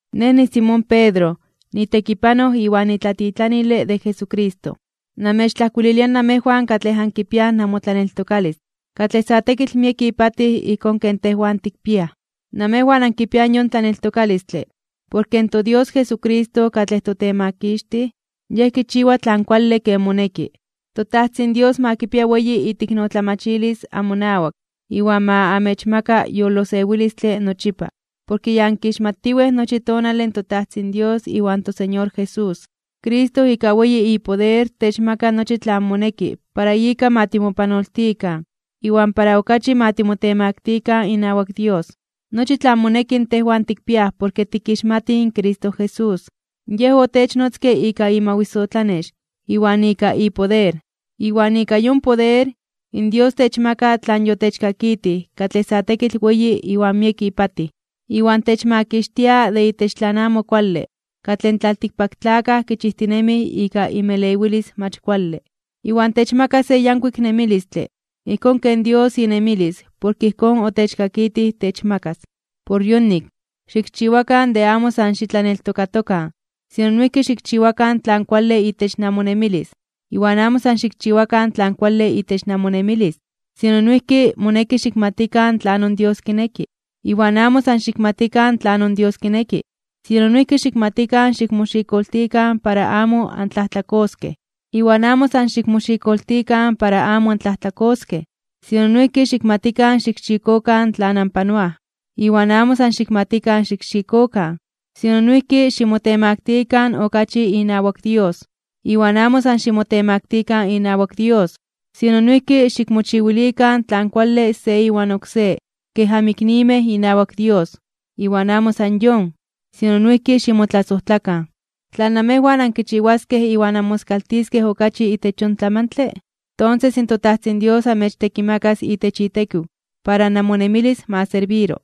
Nej niSimón Pedro, nitekipanoj iwan nitlatitlanile de Jesucristo. Namechtlajkuililia namejwan katlej ankipiaj namotlaneltokalis katlej sa tekitl miek ipatij ijkón ken tejwan tikpiaj. Namejwan ankipiaj yon tlaneltokalistle porke in toDios Jesucristo katlej toTemakixtij, Yej kichiwa tlan kuale ken moneki. ToTajtzin Dios ma kipia weyi iteiknotlamachilis amonawak iwan ma amechmaka yolosewilistle nochipa porke ya ankixmatiwej nochi tonale in toTajtzin Dios iwan toSeñor Jesús. Cristo ika weyi ipoder techmaka nochi tlan moneki para ika ma timopanoltikan iwan para okachi ma timotemaktikan (timotemaktilikan) inawak Dios. Nochi tlan moneki tejwan tikpiaj porke tikixmatij in Cristo Jesús. Yej otechnotzke ika imawisotlanex iwan ika ipoder. Iwan ika yon poder, in Dios techmaka tlan yotechkakitij katlej sa tekitl weyi iwan miek ipatij. Iwan techmakixtia de itech tlan amo kuale katlej in tlaltikpaktlakaj kichijtinemij ika inmelewilis mach kuale. Iwan techmaka se yankuik nemilistle ijkón ken Dios inemilis porke ijkón otechkakitij techmakas. Por yonik, xikchiwakan de amo san xitlaneltokakan, sino noijki xikchiwakan tlan kuale itech namonemilis. Iwan amo san xikchiwakan tlan kuale itech namonemilis, sino noijki moneki xikmatikan tlanon Dios kineki. Iwan amo san xikmatikan tlanon Dios kineki, sino noijki xikmatikan xikmoxikoltikan para amo antlajtlakoskej. Iwan amo san xikmoxikoltikan para amo antlajtlakoskej, sino noijki xikmatikan xikxikokan tlan anpanoaj. Iwan amo san xikmatikan xikxikokan, sino noijki ximotemaktikan (ximotemaktilikan) okachi inawak Dios. Iwan amo san ximotemaktikan inawak Dios, sino noijki xikmochiwilikan tlan kuale se iwan oksé kej anmiknimej inawak Dios. Iwan amo san yon, sino noijki ximotlasojtlakan. Tla namejwan ankichiwaskej iwan anmoskaltiskej okachi itech yon tlamantle, tonses toTajtzin Dios amechtekimakas itech itekiw para namonemilis ma serbiro.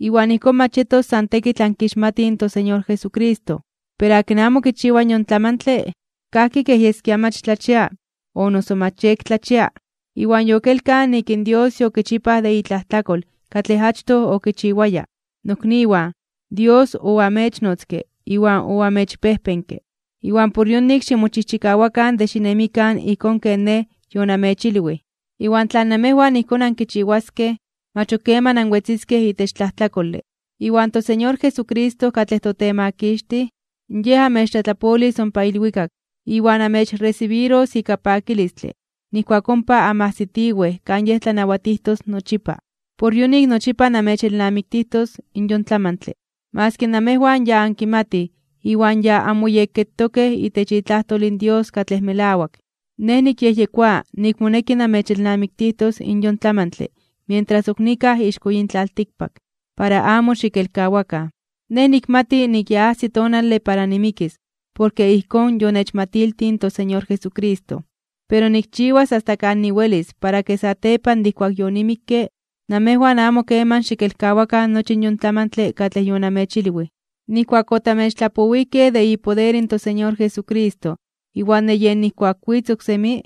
Iwan ijkón mach yetos san tekitl ankixmatij in toSeñor Jesucristo. Pero akin amo kichiwa yon tlamantle, kajki kej yeskia mach tlachia o noso mach yektlachia, iwan yokelkaj nik in Dios yokichipaj de itlajtlakol katlej achtoj okichiwaya. Nokniwan, Dios oamechnotzke iwan oamechpejpenke. Iwan por yonik ximochijchikawakan de xinemikan ijkón ken nej yonamechilwij, iwan tla namejwan ijkón ankichiwaskej, mach ok keman anwetziskej itech tlajtlakole. Iwan toSeñor Jesucristo katlej toTemakixtij, Yej amechtlatlapolis ompa ilwikak iwan amechresibiros ika pakilistle nijkuak ompa anmajsitiwej kan Yej tlanawatijtos nochipa. Por yonik nochipa namechelnamiktis yon tlamantle, maski namejwan ya ankimatij iwan ya anmoyekketokej itech itlajtol in Dios katlej melawak. Nej nikyejyekoa nik moneki namechelnamiktijtos in yon tlamantle mientras ok nikaj ixko yin tlaltikpak, para amo xikelkawakan. Nej nikmati nik ya ajsi tonale para nimikis porke ijkón yonechmatiltij in toSeñor Jesucristo. Pero nikchiwas asta kan niwelis para ke satepan de ijkuak yonimikke, namejwan amo keman xikelkawakan nochi yon tlamantle katlej yonamechilwij. Nijkuak otamechtlapowijkej de ipoder in toSeñor Jesucristo iwan de yej nijkuak witz oksemi,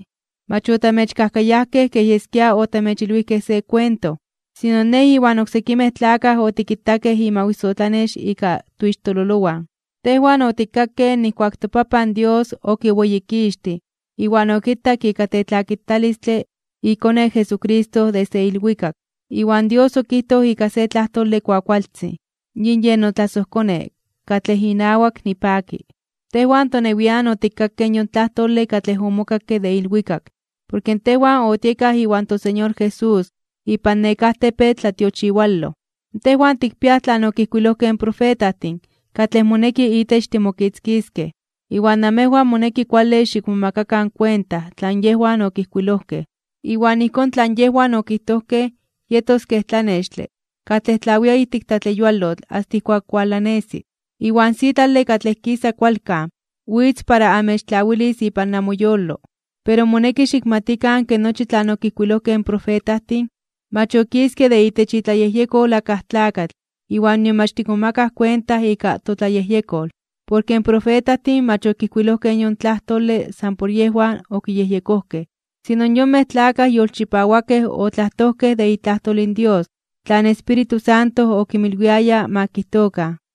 mach otamechkajkayajkej kej yeskia otamechilwijkej se kuento, sino nej iwan oksekimej tlakaj otikitakej imawisotlanex ika toixtololowan. Tejwan otikkakej nijkuak toPapan Dios okiweyikixtij iwan okitak ika tetlakitalistle iKone Jesucristo desde ilwikak, iwan Dios okijtoj ika se tlajtole kuakualtzin: “Yin yen notlasojKone, katlej inawak nipaki.” Tejwan tonewian otikkakej yon tlajtole katlej omokakke de ilwikak, porke tejwan otiekaj iwan toSeñor Jesús ipan nekáj tepetl tlatiochiwaloj. Tejwan tikpiaj tlan okijkuilojkej in profetajtin katlej moneki itech timokitzkiskej. Iwan namejwan moneki kuale xikmomakakan kuenta tlan yejwan okijkuilojkej. Iwan ijkón tlan yejwan okijtojkej yetos ken tlanextle katlej tlawia ijtik tlatleyualotl asta ijkuak walanesi. Iwan sitlale katlej kisa kualkan witz para amechtlawilis ipan namoyolo. Pero moneki xikmatikan ke nochi tlan okijkuilojkej in profetajtin, mach okiske de itech itlayejyekol akaj tlakatl iwan nion mach tikmomakaj kuenta ika totlayejyekol. Porke in profetajtin mach okijkuilojkej yon tlajtole san por yejwan okiyejyekojkej, sino in yonmej tlakaj yolchipawakej otlajtojkej de itlajtol in Dios tlan Espíritu Santo okinmilwiaya ma kijtokan.